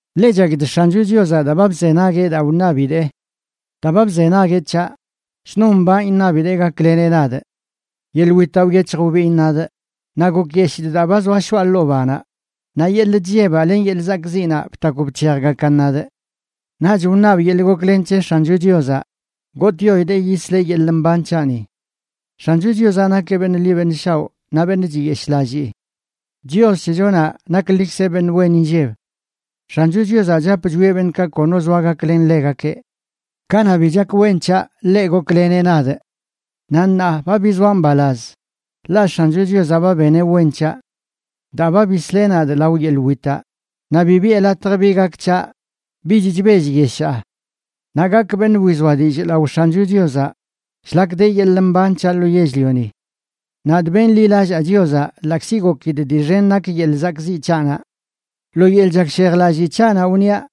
Ḻe chakidꞌ X̱ancho Chiozaꞌ daa ba bzenagueꞌ daa wṉabidee. Daa ba bzenagueꞌ c̱haꞌ, shnon mbanꞌ iṉabidee gakleneꞌ nadꞌ. Yeḻꞌ witaꞌ wyec̱hj wbiin nadꞌ naꞌ gokyeshidꞌ daa ba zoa shoꞌa ḻoo banaꞌ, naꞌ yeḻꞌ chllebaꞌ len yeḻꞌ zakꞌziꞌnaꞌ btakw bc̱hejgakan nadꞌ. Naꞌch wṉabꞌ yeḻꞌ goklen c̱he X̱ancho Chiozaꞌ, gotꞌyoidee yisleꞌ yeḻꞌ mban c̱haꞌni. X̱ancho Chiozaꞌ nakeꞌ beṉꞌ ḻi beṉꞌ shaoꞌ naꞌ beṉꞌ chiyeshꞌlallii. Chios c̱hechonaꞌ naklikzeꞌ beṉꞌ wen inlleb. X̱ancho Chiozaꞌ chap chwieꞌ beṉꞌkaꞌ kono zoa gaklen ḻegakeꞌ. Kanaꞌ bi chak wen c̱haꞌ, ḻeꞌ gokleneꞌ nadꞌ. Naꞌ ṉaa ba bizoaꞌ mbalaz, ḻaꞌ X̱ancho Chiozaꞌ ba beneꞌ wen c̱haꞌ. Daa ba bisleꞌ nadꞌ lao yeḻꞌ witaꞌ, naꞌ bi biꞌe latj bi gak c̱haꞌ, bich chbellyeshaa. Naꞌ gakꞌ beṉꞌ wizoa dillꞌ lao X̱ancho Chiozaꞌ shlak de yeḻꞌ mban c̱haꞌ lo yell-lioni. Nadꞌ benḻilallaa Chiozaꞌ, ḻaꞌkzi gokidꞌ dii xen nak yeḻꞌ zakꞌziꞌ c̱haꞌnaꞌ. Lo yeḻꞌ chakshejlallii c̱haꞌnaꞌ wniaꞌ: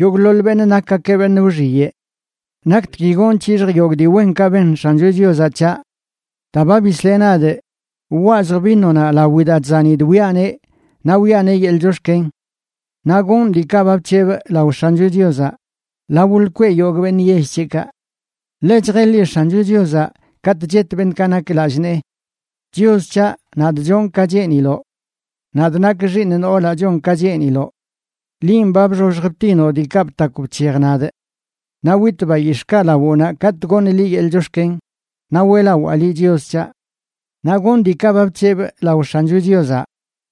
“Yogꞌḻoḻ beṉꞌ nakgakeꞌ beṉꞌ wxiyeꞌ.” ¿Naktgui gonꞌ c̱hixjꞌ yogꞌ dii wenkaꞌ ben X̱ancho Chiozaꞌ c̱haꞌ? Daa ba bisleꞌ nadꞌ, wwazjꞌ vinonaꞌ lawi daa chzanidꞌ wiꞌaneꞌ, naꞌ wiꞌaneꞌ yeḻꞌ chox̱ken. Naꞌ gonꞌ diikaꞌ ba bc̱hebꞌ lao X̱ancho Chiozaꞌ lao lkweꞌ yogꞌ beṉꞌ yell c̱heꞌkaꞌ. Ḻe chjeḻi X̱ancho Chiozaꞌ katꞌ chet beṉꞌkaꞌ nak lallꞌ nee. Chios c̱haꞌ, nadꞌ chonꞌ ka cheeniloꞌ. Nadꞌ nak xiiṉ noolaꞌ chon ka cheeniloꞌ. Linꞌ ba bxoxj btinoꞌ diikaꞌ btakw bc̱hej nadꞌ. Naꞌ witꞌ bayix̱ꞌkaꞌ lawoꞌnaꞌ katꞌ goṉꞌ liꞌ yeḻꞌ chox̱ken, naꞌ weꞌlawaa liꞌ, Chios c̱haꞌ. Naꞌ gonꞌ diikaꞌ ba bc̱hebꞌ lao X̱ancho Chiozaꞌ,